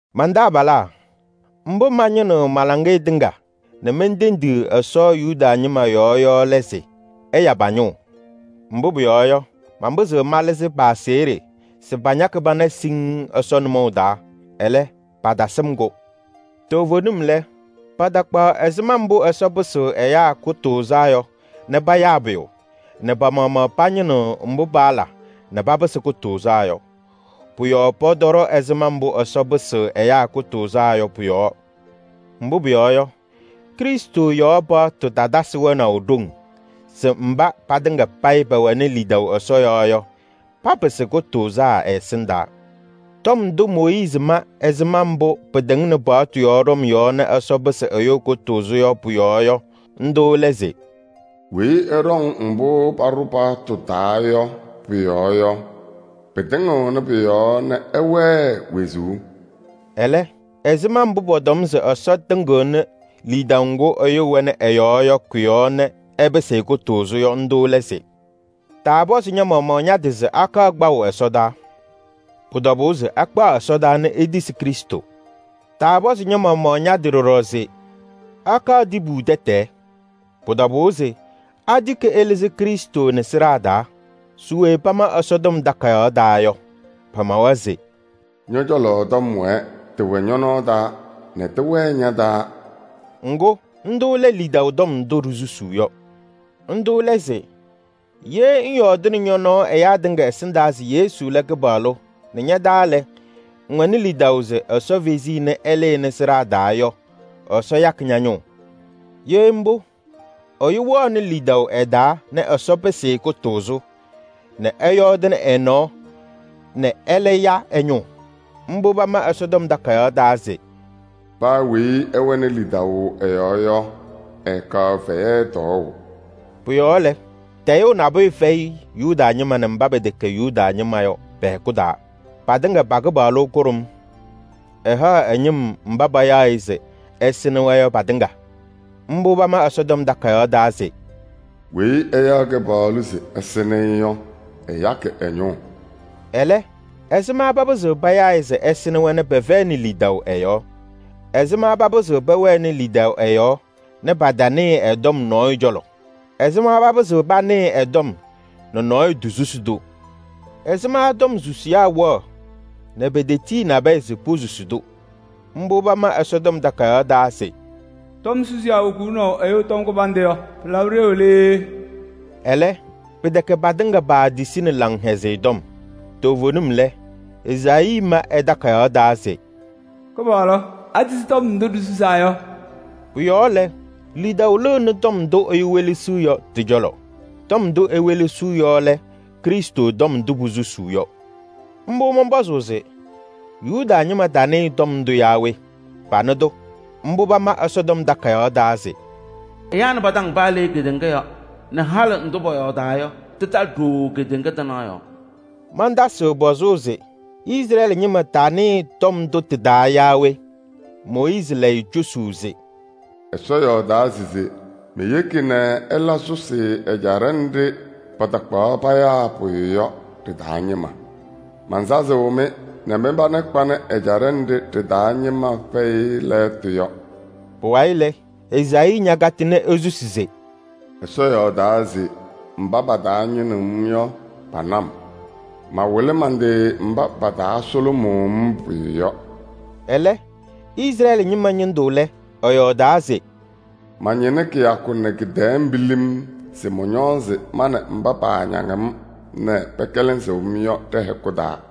Man-taabalaa, mbʋ mañɩnɩɣnɩ ma-laŋɩyɛ tɩŋa nɛ mentendiɣ Ɛsɔ Yuda ñɩma yɔɔ yɔ lɛ se: ɛya pa-ñʋʋ. Mbʋ pʋyɔɔ yɔ, manpɩzɩɣ malɩzɩ pa-aseɣɖe se pañakɩ pana siŋŋ Ɛsɔ nʋmɔʋ taa. Ɛlɛ, patasɩm-kʋ. Toovenim lɛ, patakpaɣ ɛzɩma mbʋ Ɛsɔ pɩsɩɣ ɛyaa kʋtʋʋzaa yɔ nɛ payaa pʋyʋ nɛ pa-maɣmaɣ pañɩnɩɣ mbʋ paala nɛ papɩsɩ kʋtʋʋzaa yɔ. Pʋ-yɔɔ pɔtɔɖɔ ɛzɩma mbʋ Ɛsɔ pɩsɩɣ ɛyaa kʋtʋʋzaa yɔ pʋ-yɔɔ. Mbʋ pʋyɔɔ yɔ, Krɩstʋ yɔɔ paɣtʋ tatasɩ wɛnaʋ ɖoŋ se mba patɩŋa payɩ pɛwɛnɩ lidaʋ Ɛsɔ yɔɔ yɔ, papɩsɩ kʋtʋʋzaa ɛ-ɛsɩndaa. Tɔm ndʋ Mooyiizi ma ɛzɩma mbʋ pɩtɩŋnɩ paɣtʋ yɔɔ ɖɔm yɔɔ nɛ Ɛsɔ pɩsɩ ɛyʋ kʋtʋʋzʋ yɔ pʋ-yɔɔ yɔ, ndʋ lɛ se: “Weyi ɛɖɔŋ mbʋ paɖʋ paɣtʋ taa yɔ pʋ-yɔɔ yɔ, pɩtɩŋɩɣnɩ pʋ-yɔɔ nɛ ɛwɛɛ wezuu.” Ɛlɛ, ɛzɩma mbʋ pɔtɔm se Ɛsɔ tɩŋɩɣnɩ lidaʋ ŋgʋ ɛyʋ wɛnɩ ɛ-yɔɔ yɔ kʋ-yɔɔ nɛ ɛpɩsɩ-ɩ kʋtʋʋzʋ yɔ, ndʋ lɛ se: “Taapɔzɩ ña-maɣmaɣ ña-tɩ se akaɣ kpaʋ ɛsɔdaa?” Pʋ-tɔbʋʋ se akpaɣ ɛsɔdaa nɛ etisi Krɩstʋ. Taapɔzɩ ña-maɣmaɣ ña-tɩ ɖɔɖɔ se: “Akaɣ tibu tɛtɛɛ?” Pʋ-tɔbʋʋ se atiki ɛlɩzɩ Krɩstʋ nɛ sɩɖaa taa. Se we pama Ɛsɔtɔm Takayaɣ taa yɔ? Pamawa se: “Ñɔ-cɔlɔ tɔm wɛɛ, tɩwɛ ñɔ-nɔɔ taa nɛ tɩwɛɛ ña-taa.” Ŋgʋ, ndʋ lɛ lidaʋ tɔm ndʋ ɖisusuu yɔ. Ndʋ lɛ se: ye ŋyɔɔdɩnɩ ñɔ-nɔɔ ɛyaa tɩŋa ɛsɩndaa se Yesu lɛ Kɩpaɣlʋ nɛ ña-taa lɛ, ŋwɛnɩ lidaʋ se Ɛsɔ fezi-i nɛ ɛlɩnɩ sɩɖaa taa yɔ, Ɛsɔ yakɩ ña-ñʋʋ. Ye mbʋ, ɛyʋ wɛɣnɩ lidaʋ ɛ-taa nɛ Ɛsɔ pɩsɩ-ɩ kʋtʋʋzʋ, nɛ ɛyɔɔdɩnɩ ɛ-nɔɔ nɛ ɛlɛ ya ɛ-ñʋʋ. Mbʋ pama Ɛsɔtɔm Takayaɣ taa se: “Paa weyi ɛwɛnɩ lidaʋ ɛ-yɔɔ yɔ, ɛɛkaɣ fɛyɛ tɔɔʋ.” Pʋ-yɔɔ lɛ, tayʋʋ nabʋyʋ fɛyɩ Yuda ñɩma nɛ mba pɛtɛkɛ Yuda ñɩma yɔ pɛ-hɛkʋ taa: patɩŋa pa-Kɩpaɣlʋ kʋɖʋm, ɛlɛ haɣ ɛ-ñɩm mba payaɣ-ɩ se ɛsɩnɩ-wɛ yɔ patɩŋa. Mbʋ pama Ɛsɔtɔm Takayaɣ taa se: “Weyi ɛyaɣ Kɩpaɣlʋ se ɛsɩnɩ-ɩ yɔ, ɛyakɩ ɛ-ñʋʋ.” Ɛlɛ, ɛzɩma papɩzɩɣ payaa-ɩ se ɛsɩnɩ-wɛ nɛ pɛfɛyɩnɩ lidaʋ ɛ-yɔɔ? Ɛzɩma papɩzɩɣ pɛwɛnɩ lidaʋ ɛ-yɔɔ nɛ patanɩɩ ɛ-tɔm nɔɔyʋ cɔlɔ? Ɛzɩma papɩzɩɣ panɩɩ ɛ-tɔm nɛ nɔɔyʋ tosusi-tʋ? Ɛzɩma tɔm susiyaa wɛɣ nɛ petetiyi nabɛyɛ se posusi-tʋ? Mbʋ pama Ɛsɔtɔm Takayaɣ taa se: “Tɔm susiyaa wokuuni ɛyʋ tɔm kɩbandʋ yɔ, pɩlabɩ ɖeu lɛ yee!” Ɛlɛ, pɩtɛkɛ patɩŋa paatisini Laŋhɛzɩyɛ Tɔm. Toovenim lɛ, Ezaayii ma ɛ-takayaɣ taa se: “Kɩpaɣlʋ, atisi tɔm ndʋ ɖisusaa yɔ?” Pʋ-yɔɔ lɛ, lidaʋ lɩɣnɩ tɔm ndʋ ɛyʋ welesiɣ yɔ tɩ-cɔlɔ. Tɔm ndʋ ewelesiɣ yɔ lɛ Krɩstʋ tɔm ndʋ posusuu yɔ. Mbʋ mɔnpɔzʋʋ se: patanɩɩ tɔm ndʋ yaa we? Panɩ-tʋ. Mbʋ pama Ɛsɔtɔm Takayaɣ taa se: “Ɛyaa nɩ pa-taŋ paa le. Halɩ pɩtalɩ ɖooo kedeŋa tɩnaɣ yɔɔ.” Mantasɩɣ pɔzʋʋ se: Izrɛɛlɩ ñɩma tanɩɩ tɩ-taa yaa we? Mooyiizi layɩ cosuu se:“Ɛsɔ yɔɔdaa se: ‘Meyeki nɛ ɩla sʋsɩ ɛjaɖɛ nɖɩ patakpaɣ payaa pʋyʋ yɔ ɖɩ-taa ñɩma. Mansazɩɣ-mɩ nɛ mɩ-pana kpanɩ ɛjaɖɛ nɖɩ ɖɩ-taa ñɩma fɛyɩ lɛɣtʋ yɔ.’” Pʋwayɩ lɛ, Ezaayii ñacanɩ susuu se: “Ɛsɔ yɔɔdaa se: ‘Mba pataañɩnɩɣ-m yɔ, pana-m. Mawɩlɩ man-tɩ mba pataasʋlʋmʋʋ-m pʋyʋ yɔ.’” Ɛlɛ, Izrɛɛlɩ ñɩma ñɩndʋ lɛ, ɛyɔɔdaa se: “Mañɩnɩ kɩyakʋ nɛ kɩ-tɛɛ pilim se mɔñɔɔzɩ ma nɛ mba paañaŋ-m nɛ pɛkɛlɛsɩɣ-m yɔ ɖɛ-hɛkʋ taa.”